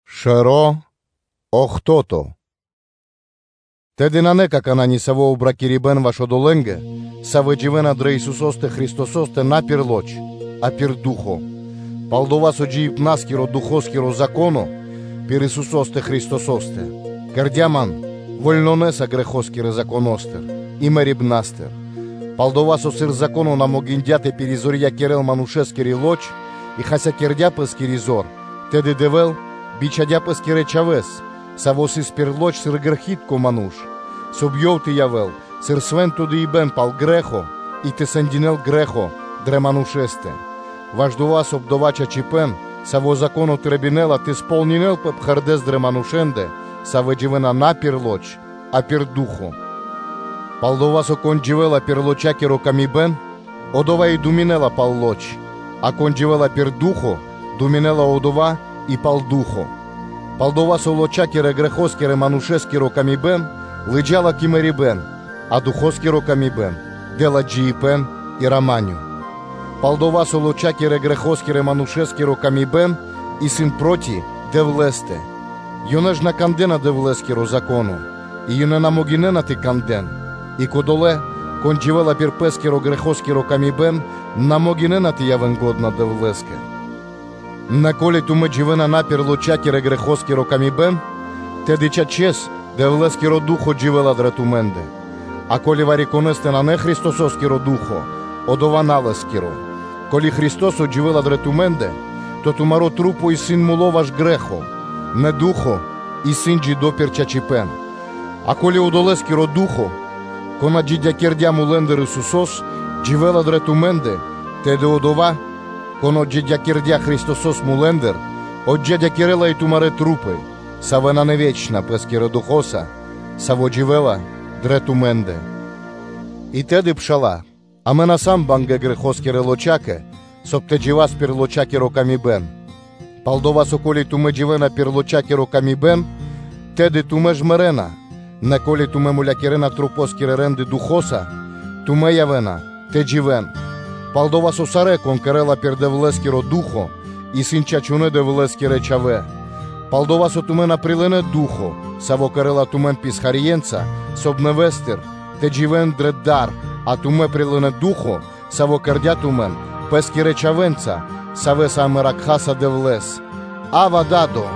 Джиибэ́н дро Ду́хо (Фа́но) Тэды, нанэ какана́ нисаво́ обракирибэн ваш одолэ́нгэ, савэ́ дживэ́на дрэ Исусо́стэ Христосо́стэ на пир лоч (плоть), а пир Ду́хо (Фа́но). Пал-дова́ со джиибна́скиро Духоскиро Зако́но пир Исусо́стэ Христосо́стэ кэрдя́ ман вольнонэса грэхоскирэ Законо́стыр и мэрибна́стыр. Пал-дова́ со, сыр Зако́но на могиндя́ тэ пиризорьякирэл манушэскири лоч, и хасякирдя́ пэ́скири зор, тэды Дэвэ́л бичхадя́ Пэ́скирэс Чхавэ́с, Саво́ сыс дрэ лоч (плоть), сыр грэхи́тко ману́ш, соб (кай) Ёв тэ явэ́л сыр свэ́нто дыибэ́н (жэ́ртва) пал грэ́хо и тэ сэндякирэ́л грэ́хо дрэ манушэ́стэ, ваш дова́, соб (кай) дова́ чачипэ́н, саво́ Зако́но трэбинэла, тэ сполнинэ́лпэ пхэрдэ́с дрэ манушэ́ндэ, савэ́ дживэ́на на пир лоч, а пир Ду́хо (Фа́но). Пал-дова́ со, кон дживэ́ла пир лоча́киро тырдыпэ́н, одова́ и думинэ́ла пал лоч, а кон дживэ́ла пир Ду́хо (Фа́но), одова́ думинэ́ла и пал Ду́хо (Фа́но). Пал-дова́ со лоча́кирэ-грэхо́скирэ Манушэ́скиро тырдыпэ́н лыджа́ла кэ мэрибэ́н, а Духоскиро тырдыпэ́н дэ́ла джиибэ́н и рама́нё (миро). Пал-дова́ со лочакирэ-грэхоскирэ-манушэ́скиро тырдыпэ́н исын проти Дэвлэ́стэ: ёнэ ж на кандэ́на Дэвлэ́скиро Зако́но, и ёнэ на могинэ́на тэ кандэ́н; и кодолэ́, кон дживэ́ла пир пэ́скирэ-грэхоскиро тырдыпэ́н, на могинэ́на тэ явэ́н лачхэ́ Дэвлэ́скэ. Нэ ко́ли тумэ́ дживэ́на на пир лоча́кирэ-грэхо́скиро тырдыпэ́н, тэды, чачэс, Дэвлэ́скиро Ду́хо (Фа́но) дживэ́ла дрэ тумэ́ндэ; а, ко́ли вари-конэ́стэ нанэ Христосо́скиро Ду́хо (Фа́но), одова́ исын на Лэ́скиро: ко́ли Христо́со дживэ́ла дрэ тумэ́ндэ, то тумари́ лоч исын мулы ваш грэ́хо, нэ Ду́хо (Фа́но) исын джидо́ пирда́л чачипэ́н. А ко́ли Одолэскиро Ду́хо (Фа́но), Кон отджидякирдя́ мулэ́ндыр Исусо́с, дживэ́ла дрэ тумэ́ндэ, тэды Одова́, Кон отджидякирдя́ Христосо́с мулэ́ндыр, отджидякирэла и тумарэ́ маса́, савэ́ исын на вечна, Пэ́скирэ Духо́са, саво́ дживэ́ла дрэ тумэ́ндэ. И тэды, пшала́лэ, амэ на сам бангэ́ грэхо́скирэ лоча́кэ, соб (кай) тэ джива́с пир лочакиро тырдыпэ́н; пал-дова́, со ко́ли тумэ́ дживэ́на пир лочакиро тырдыпэ́н, тэды тумэ́ ж мэрэ́на, нэ ко́ли тумэ́ мулякирэна тумарэ́ свэтытка рэ́нды Духо́са, тумэ́ явэ́на тэ дживэ́н: пал-дова́ со сарэ́, кон кэрэ́ла пир Дэвлэ́скиро Ду́хо (Фа́но), исын чачунэ́ Дэвлэ́скирэ Чхавэ́. Палдова́ со тумэ́ на прилынэ́ Ду́хо (Фа́но), Саво́ кэрэ́ла тумэн писхарье́нца, соб (кай) нэвэ́стыр тэ дживэ́н дрэ дар, а тумэ́ прилынэ́ Ду́хо (Фа́но), Саво́ кэрдя́ тумэн пэ́скирэ чхавэ́нца, савэ́са амэ кхараса Дэвлэ́с: “Авва, Да́до!”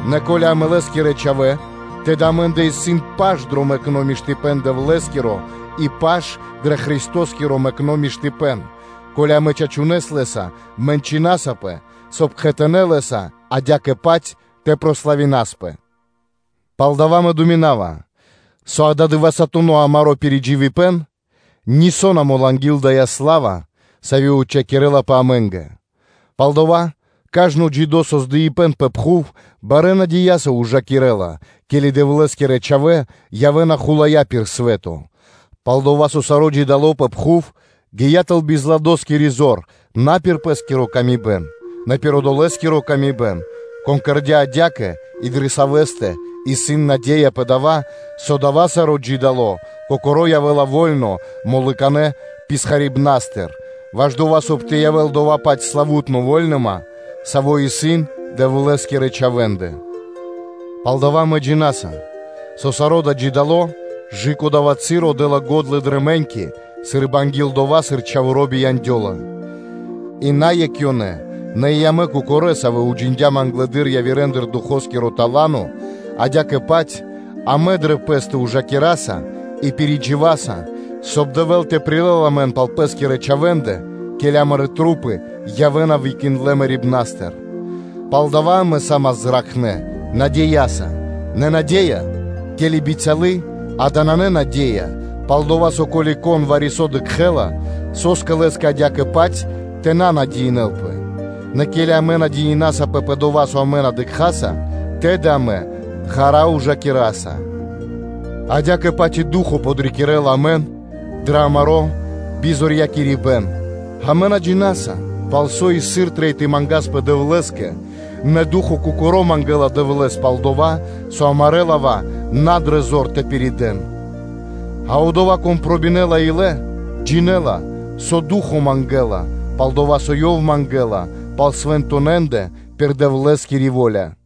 Нэ ко́ли амэ сам Лэ́скирэ чхавэ́, тэды амэ́ндэ исын паш дро мэкно́ миштыпэ́н Дэвлэ́скиро и паш дро Христосо́скиро мэкно́ миштыпэ́н, ко́ли амэ чачунэ́с Лэ́са мэнчынасапэ, соб (кай) кхэтанэ́ Лэ́са адя́кэ-паць тэ прославинаспэ. Палдава́ мэ думинава, со ададывэсатуно амаро́ пиридживибэн нисо́ на мол анги́л дая́ сла́ва, сави́ отчхакирэлапэ амэ́нгэ. Палдава́ кажно джидо́ создыибэн пэ пхув, барэ́ надеяса ужакирэ́ла, ке́ли Дэвлэ́скирэ чхавэ́ явэ́на хулая́ пир свэ́то: пал-дова́ со саро́ джидо́ создыибэн пэ пхув гия́ тэл бизладоскири зор на пир пэ́скиро выкэдыибэн, нэ пир Одолэскиро выкэдыибэн, Кон кэрдя́ адя́кэ и дрэ Савэ́стэ исын наде́я пэ дава́, со дава́ саро́ джидо́ создыибэн кокоро́ явэ́ла во́льно мулыканэ писхарибнастыр, ваш дова́, соб (кай) тэ явэ́л дова́-паць славу́тно вольныма, сави́ исын Дэвлэ́скирэ чхавэ́ндэ. Палдава́ амэ джина́са, со саро́ дава́ джидо́ создыибэн кэ дава́ часо дэ́ла го́дла дрэ мэ́ньки, сы́рбы анги́л дова́, сыр чхаворо́ бияндёла. И на екх ёнэ, нэ и амэ кокорэ́, савэ́ уджиндям англэды́р явирэндыр Духоскиро тала́но, адя́кэ-паць амэ андра́л пэ́стэ ужакираса и пхарэ́с даса ґондя́ (уздыхинаса), соб (кай) Дэвэ́л тэ прилэл амэн пал пэ́скирэ чхавэ́ндэ, ке́ли амарэ́ маса́ явэ́на выкиндлэ мэрибна́стыр. Палдава́ амэ са́мас зракхнэ́ надеяса; нэ наде́я, ке́ли исын бицялы, дава́ нанэ наде́я: пал-дова́ со, ко́ли кон вари-со дыкхэ́ла, со́скэ лэ́скэ адя́кэ-паць тэ надеинэлпэ? Нэ ке́ли амэ надеинасапэ пэ дова́, со амэ на дыкхаса, тэды амэ ґара́ (длу́гэс) ужакираса. Адя́кэ-паць и Ду́хо (Фа́но) подрикирэ́ла амэн дрэ амаро́ бизорьякирибэн; амэ на джина́са, пал со и сыр трэй тэ мангаспэ Дэвлэ́скэ, нэ Ду́хо кокоро́ мангэ́ла Дэвлэ́с пал дова́, со амарэ́ лава́ исын на дрэ зор тэ пиридэл. А Одова́, Кон пробинэла илэ, джинэ́ла, пал со Ду́хо (Фа́но) мангэ́ла, пал-дова́ со Ёв мангэлапэ пал свэнтонэндэ пир Дэвлэ́скири во́ля.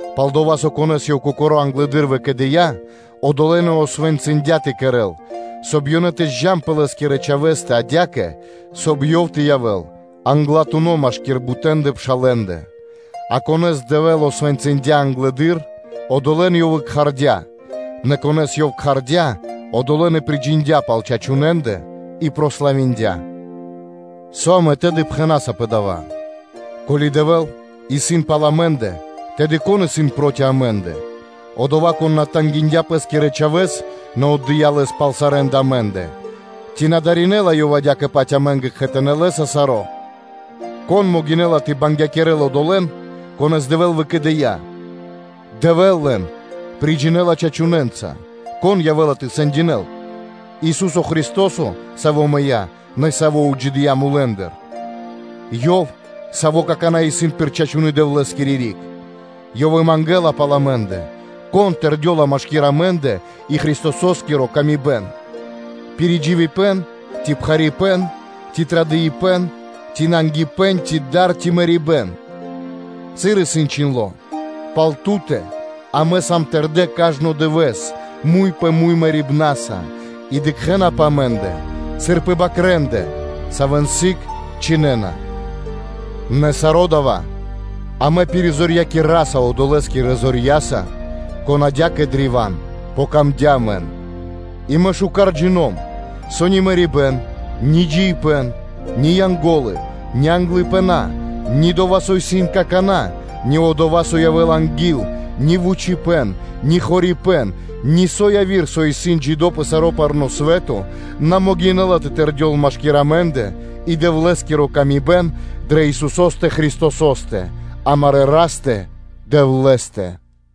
Палдова́ со, конэ́с Ёв кокоро́ англэды́р выкэдыя́, одолэ́н и освэнцындя тэ кэрэ́н, соб (кай) ёнэ тэ подджан пэ Лэ́скирэ Чхавэ́стэ, адя́кэ, соб (кай) Ёв тэ явэ́л англатуно́ машки́р бутэндэ пшалэ́ндэ. А конэ́с Дэвэ́л освэнцындя англэды́р, одолэ́н Ёв и кхардя́, нэ конэ́с Ёв кхардя́, одолэ́н и приджиндя пал чачунэндэ, и барьякирдя. Со амэ тэды пхэна́са пэ дава́? Ко́ли Дэвэ́л исын пал амэ́ндэ, тэды кон исын проти амэ́ндэ? Одова́, Кон на тангиндя Пэ́скирэ Чхавэ́с, нэ Ёв отдыя́ Лэс пал сарэ́ндэ амэ́ндэ, ци на даринэла Ёв адя́кэ-паць амэ́нгэ кхэтанэ́ Лэ́са саро́? Кон могинэ́ла тэ бангякирэл одолэ́н, конэ́с Дэвэ́л выкэдыя́? Дэвэ́л приджинэла лэн чачунэнца: кон явэ́ла тэ сэндякирэ́л? Ису́со Христо́со, Саво́ мыя́, нэ и Саво́ отджидыя́ мулэ́ндыр? Ёв, Саво́ какана́ исын пир чачуны́ Дэвлэ́скири риг? Ёв и мангэ́ла пал амэ́ндэ. Кон тэрдёла машки́р амэ́ндэ и Христососкири ла́ска? Пиридживибэн, ци пхарипэ́н, ци традыпэн, ци нангипэ́н, ци дар, ци мэрибэ́н? Сыр исын чхиндло́: “Пал Ту́тэ амэ сам тэрдэ́ кажно дывэ́с муй пэ муй мэрибнаса; и дыкхэ́на пэ амэ́ндэ, сыр пэ бакрэндэ, савэ́н сыг чхинэна.” Нэ саро́ дава́ амэ пиризорьякираса Одолэскирэ зорья́са, Конэ́скэ адя́кэ древа́н амэ яця́м дро́га. И мэ миштэ́с джино́м, со ни мэрибэ́н, ни джиибэ́н, ни Янго́лы, ни англыпына, ни дова́, со исын какана́, ни дова́, со явэ́ла анги́л; ни вучипэ́н, ни хорипэ́н, нисо́ яви́р, со исын джидо́ пэ саро́ парно́ свэ́то, на могинэ́ла тэ тэрдёл машки́р амэ́ндэ и Дэвлэ́скири ла́ска дрэ Исусо́стэ Христосо́стэ, амарэ́ Растэ-Дэвлэ́стэ.